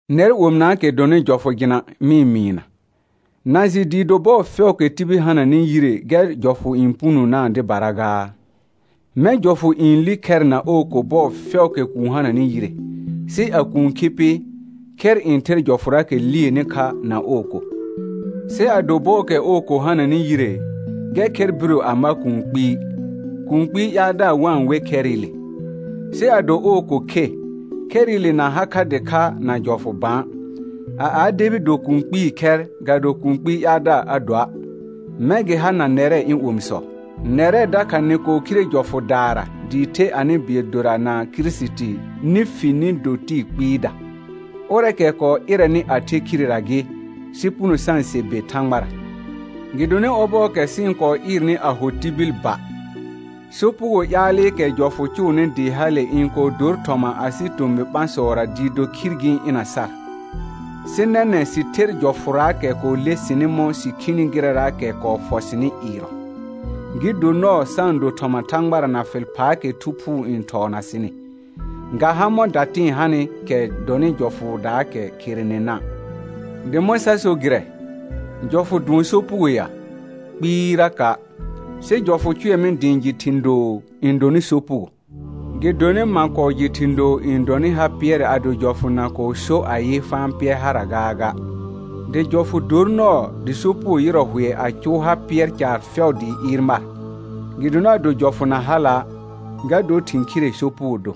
Nɛr omɩnaakɛ dɔnɩ jɔfʋ jɩna mɩ-n mɩɩna, na jɩ dɩɩ do bɔɔ fɛʋʋkɛ tibil hananɩ yire gɛr jɔfʋ n punonaa dɩbara gaa? Mɛ̃ jɔfʋ n li khɛr na ɔɔ ko bɔɔ fɛʋʋkɛ kuun hananɩ yire, sɩ a kuun khi pɩ, khɛr n ther jɔfʋraakɛ lieni kha na ɔɔ ko. Sɩ ado bɔɔkɛ ɔɔ ko hananɩ yire, gɛr khɛr biro a ma kũu kpɩɩ, kũu kpɩɩ ƴaaldaar wa-n we khɛrɩle; sɩ ado ɔɔ ko khe, khɛrɩle na ha kha dɩkha na jɔfʋ bã, a a debi do kũu kpɩɩ khɛr ga do kũu kpɩɩ ƴaaldaar a doa'. Mɛ̃ gɩ ha na nɛrɛ ɩ̃ omisɔ; nɛrɛ dakha nɩ kɔɔ khire jɔfʋdaara dɩɩ the anɩ bɩɛl dora na Kirisiti nɩ fi nɩ do tɩɩ kpɩɩda, ʋrɛɛkɛ kɔɔ ɩrɛnɩ a the khirera gɩ, sɩ puno sa-n se be Thãgbara. Gɩdonɩ ɔbɔɔkɛ sɩ-n kɔɔ ɩɩrnɩ a ho tibil ba, sopugoo ƴaalɩkɛ jɔfʋ cʋʋnɩ dɩɩ hale n kɔɔ dor thɔma asɩ tomɩ ɓãsɔra dɩɩ do khir gɩ-n ɩna sar. Sɩ nɛnɛ̃ sɩ ther jɔfʋraakɛ kɔɔ le sɩnɩ mɔ̃ sɩ khini gɩrɛraakɛ kɔɔ fɔ sɩnɩ ɩɩrɔ, gɩ do nɔɔ sa-n do thɔma Thãgbara na fɩl phaakɛ Thu Phuu n thɔɔna sɩnɩ, ga ha mɔ̃ datɩ̃ɩ hanɩ kɛ dɔnɩ jɔfʋʋdaakɛ kherenena'. Dɩ mɔ̃ sa so gɩrɛ? Jɔfʋ dʋɔn sopugo ya? Kpɩɩraka'. Sɩ jɔfʋ cʋɛ mɩ dɩ ɩ̃ jɩ thɩ̃ doo n dɔnɩ sopugo; gɩdonɩ ma kɔɔ jɩ thĩ doo n dɔnɩ ha pɩɛrɛ ado jɔfʋ na kɔɔ so ayɩ, fa-n Pɩɛr hara gaaga. Dɩ jɔfʋ dor nɔɔ dɩ sopugo yɩrɔ hʋɛ a cʋʋ ha pɩɛr caar fɛʋ dɩɩ ɩɩr mar, gɩdonɩ ado jɔfʋ na hala', ga dor thĩ khire sopugo do.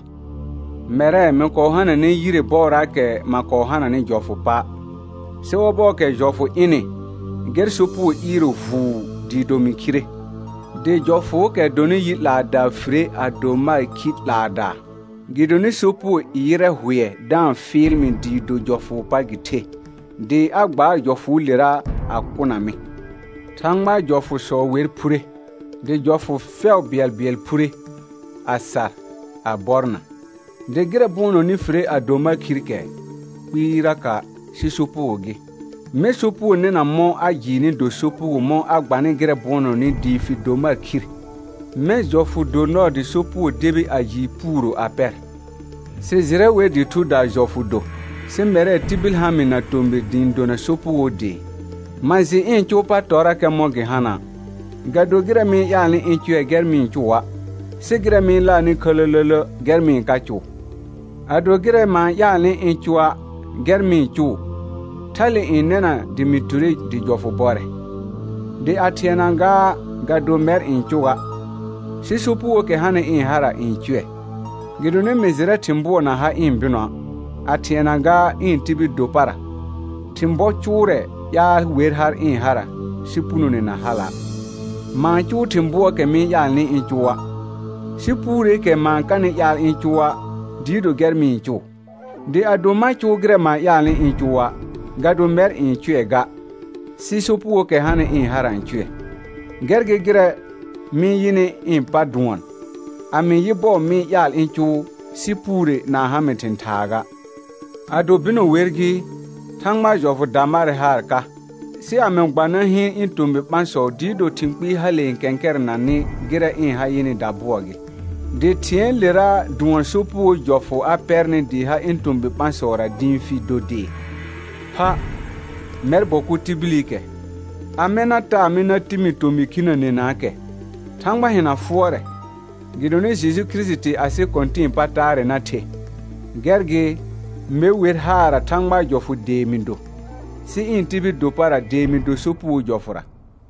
Mɛrɛ mɩ kɔɔ hananɛ yire bɔɔraakɛ ma kɔɔ hananɩ jɔfʋ pa', sɩ ɔbɔɔkɛ jɔfʋ ɩnɩ, gɛr sopugo ɩɩrɔ vuu dɩɩ do mɩ khire. Dɩ jɔfʋʋkɛ dɔnɩ yi 'laadaa fire a do mar khi 'laadaa. Gɩdonɩ sopugo yɩrɛ hʋɛ da-n fɩɩl mɩ dɩɩ do jɔfʋʋ pa gɩ the, dɩ a gbaar jɔfʋʋlera a kʋna mɩ. Thãgbaa jɔfʋsɔ wer phure, dɩ jɔfʋ fɛʋ bɩɛlbɩɛl phure, a sar, a bɔrna. Dɩ gɩrɛ bʋɔnɔnɩ fire a do mar khir kɛ? Kpɩɩraka', sɩ sopugo gɩ; mɛ̃ sopugo nɩna mɔ̃ a jɩɩnɩ do sopugo mɔ̃ a gbanɩ gɩrɛ bʋɔnɔnɩ dɩɩ fi do mar khir; mɛ̃ jɔfʋ do nɔɔ dɩ sopugo debi a jɩɩ puuro a pɛr. Sɩ jɩrɛ wer dɩ thudaa jɔfʋ do, sɩ mɛrɛ tibil ha mɩ na tomɩr dɩ ɩ̃ dona sopugoo dee. Ma jɩ ɩ̃ cʋʋ pa tɔrrakɛ mɔ̃ gɩ hana', ga do gɩrɛ mɩ-n ƴaalnɩ ɩ̃ cʋɛ gɛr mɩ-n cʋa', sɩ gɩrɛ mɩ-n laarnɩ khələlələ gɛr mɩ-n ka cʋʋ. Ado gɩrɛ ma-n ƴaalnɩ ɩ̃ cʋa' gɛr mɩ-n cʋʋ, thale n nɛna dɩ mɩ ture dɩ jɔfʋ bɔrɛ. Dɩ a thɩɛna gaa ga do mɛr n cʋ ga, sɩ sopugookɛ hanɩ ɩ̃ hara n cʋɛ. Gɩdonɩ mɩ jɩrɛ thɩ̃ bʋɔ na ha ɩ̃ bɩnɔa', a thɩɛna gaa ɩ̃ tibil do para; thɩ̃ bɔ cʋʋrɛɛ ƴaal wer har ɩ̃ hara, sɩ punone na hala'. Ma-n cʋʋ thɩ̃ bʋɔɔkɛ mɩ-n ƴaalnɩ ɩ̃ cʋa', sɩ puureekɛ ma-n kanɩ ƴaal ɩ̃ cʋa' dɩɩ do gɛr mɩ-n cʋʋ. Dɩ ado ma cʋʋ gɩrɛ ma-n ƴaalnɩ ɩ̃ cʋa', ga do mɛr ɩ̃ eʋ ga sɩ sopugookɛ hanɩ ɩ̃ hara n cʋɛ. Gɛr gɩ gɩrɛ mɩ yɩnɩ ɩ̃ pa dʋɔn: A mɩ yɩ bɔɔ mɩ ƴaal ɩ̃ cʋʋ sɩ puure na-n ha mɩ thɩ̃ thaa ga. Ado bɩnɔ wer gɩ, Thãgbaa jɔfʋ da marɛ haar ka, sɩ a mɩ gba na hɩɩn ɩ̃ tomɩ ɓãsɔ dɩɩ do thɩ̃ kpɩɩ hale n kɛ̃kɛrɛnanɩ gɩrɛ ɩ̃ ha yɩnɩ dabʋɔ gɩ, dɩ thɩ̃ɛɛlera dʋɔn sopugoo jɔfʋ a pɛrnɩ dɩɩ ha ɩ̃ tomɩ ɓãsɔra dɩ ɩ̃ fi do dee. Pha, mɛr bɔ kʋ tibilikɛ, amɛ na taa mɩ na ti mi tomɩ khinənenaakɛ? Thãgba hɩna fʋɔrɛ, gɩdonɩ Jeju Kirisiti asɩ Kɔ̃tɩ̃ɩ pa taarɛ na the. Gɛr gɩ, me wer haarra Thãgbaa jɔfʋʋ dee mɩ do, sɩ ɩ̃ tibil do para dee mɩ do sopugoo jɔfʋra.